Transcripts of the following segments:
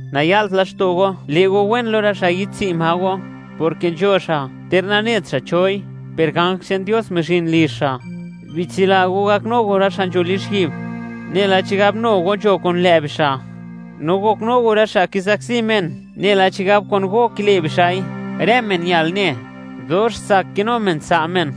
Naya'lt laxto' go le' go wen lo rë xa' yi'dtsi' ma go, porke nzho xa', ter nanet xa' choi, per ganj che'n Dios mizhin lizh xa'. Bitsila go gaknu go rë xa' nzho lizhyi'b, nela chigab nu go nzho kun lë' bixa'; no goknu go rë xa' kizakzi men, nela chigab kun go kile' bixa'i. Rë men ñal ne, dox tsak kinu men tsa' men,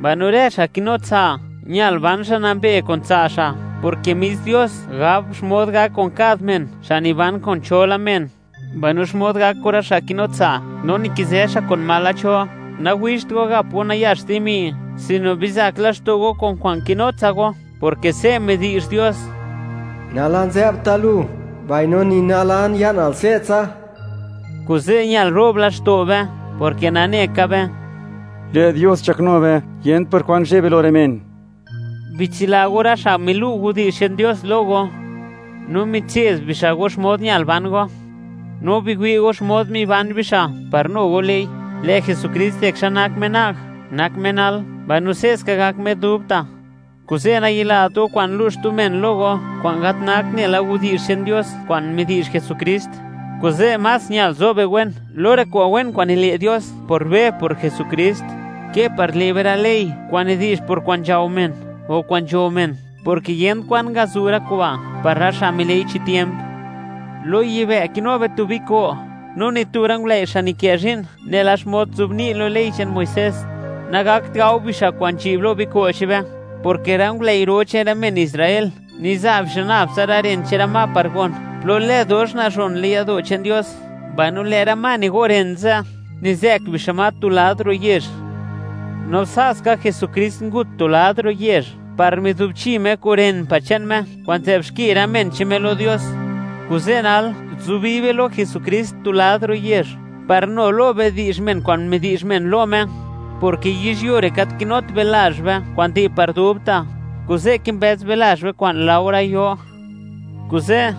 mbaino rë xa' kinu tsa', ñal ban xa' nambe kun tsa' xa'; porke mis Dios gab xmod gak kun kad men xa' niban kun cho la men, mbaino xmod gak kun rë xa' kinu tsa' no nikizë kun xtu men. Nawixt go gap go nayax dimi, sino bizak laxto' go kun kwa'n kinu tsa go, porke se' midi'zh Dios: “Nalan zë'bta' lu, mbaino ni nalan, ya'nal se'tsa.” Kuze' ñal ro'b laxto' be porke nane ka be: Lë' Dios nzhaknu be, yent por kwan zheb be lo rë men. Bitsila go rë xa' milu' widi'zh che'n Dios lo go, no mitse'd bixa' go xmod ñal ban go; no biwi' go xmod miban bixa', par nu go le'i. Lë' Jesukrist di xa nak Me na'g, nak Me nal, mbaino se'ska gak Me dubta'. Kuze', nayilat go kwa'n lu' xtu men lo go kwa'n gat nakt nela widi'zh che'n Dios kwa'n midi'zh Jesukrist; kuze' más ñal zo be wen lo rë kwa'n wen kwa'n nile' Dios por be por Jesukrist, ke par le' be rë ley kwa'n nidi'zh por kwa'n nzhao men o kwa'n nzho men, porke yent kwan ngazu' rë kuba' par rë xa' mile'i chi tiemp. Lo yibë' kinu be tu biko', no ni tu rë ngulëi' xa' nikë zhi'n nela xmod nzobni' lo ley che'n Muisés, nagakt gao bixa' kwa'n nzhi'b lo biko' che'n be, porke rë ngulëi' ro che'n rë men Israel, niza' bixa' nab tsa rë ren che'n rë ma par gon plo lë dox nazhon le'n yado' che'n Dios, mbaino lë' rë ma nigo' ren ze' nizë'k bixa' ma tu lad ro' yezh. No sa' ska, Jesukrist ngut tu lad ro' yezh, par mizubchi Me kun ren pa' che'n Me kwa'n nzë'b xki rë men che'n Me lo Dios. Kuze' nal, zubi be lo Jesukrist tu lad ro' yezh, par nu lo be di'zh men kwa'n midi'zh men lo Me, porke yizhyuo re' gat kinut be lazh be kwa'n di' par dubta', kuze' kimbëz be lazh be kwa'n laore yo. Kuze',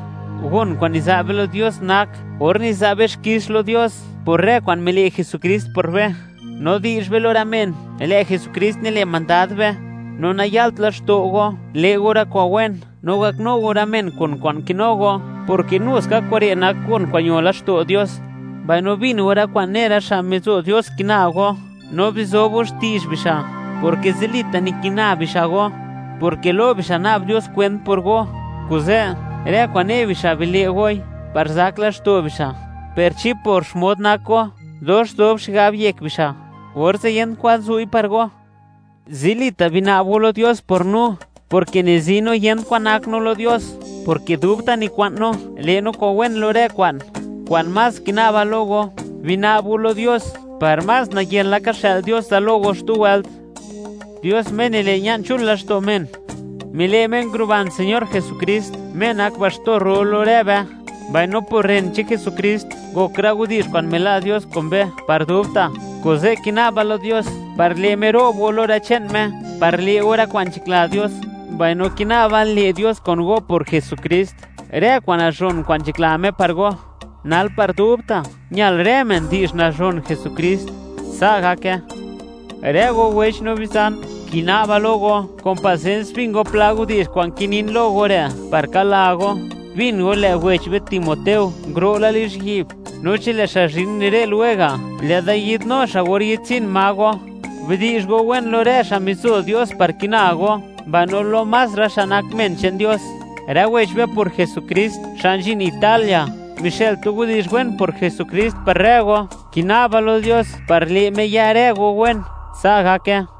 gon kwa'n niza' be lo Dios nak, or niza' be xkix lo Dios por rë kwa'n mile' Jesukrist por be, no di'zh be lo rë men, lë' Jesukrist nile' mandad be. No naya'lt laxto' go, le' go rë kwa'n wen, no gaknu go rë men kun kwa'n kinu go, porke nu ska kure' nak gon kwa'n ño laxto' Dios. Mbaino bin go rë kwa'n ne rë xa' mizo Dios kina go, no bizob go xti'zh bixa', porke zilita' nikina bixa' go, porke lo bixa' na'b Dios kwent por go. Kuze', rë kwa'n ne bixa' bile' goi, par zak laxto' bixa'; per chi por xmod nak go dox zob xigab yek bixa', orze' yent kwan zu'i par go. Zilita', bina'b go lo Dios por no, porke nizi no, yent kwan nak no lo Dios, porke dubta' nikwa'n no le' no kwa'n wen lo rë kwa'n. Kwa'n más kina'ba lo go, bina'b go lo Dios par nayen laka xë'l Dios da lo go xtu wëlt. Dios Me nile', ña'n chul laxto' men, mile' Me nguruban Señor Jesukrist, Me nak Baxtor ro lo rë be; mbaino por ren che'n Jesukrist, ngok rë widi'zh kwa'n mila' Dios kun be, par dubta'. Kuze', kina'ba lo Dios par le' Me ro'b go lo rë che'n Me, par le' go rë kwa'n nzhakla Dios; mbaino kina'ba, le' Dios kun go por Jesukrist, rë kwa'n nazhon kwa'n nzhakla Me par go. ¡Nal par dubta', ñal rë men di'zh nazhon Jesukrist! Sa' gake. Rë go wech no bizan, kina'ba lo go, kun pasens bin go pla widi'zh kwa'n kinin lo go re' par kala go. Bin go, lë' wech be Timoteo nguro' la lizhyi'b; no chi lë' xa' zhin re' lwega', lë'da yi'dnu xa' or yi'dtswi'n ma go. Bidi'zh go wen lo rë xa' mizo Dios par kina go, mbaino lo más rë xa' nak men che'n Dios. Rë wech be por Jesukrist, xa' nzhin Italia, mixë'l tu widi'zh wen por Jesukrist, par rë go. Kina'ba lo Dios, par le' Me ya rë go wen. Sa' gake.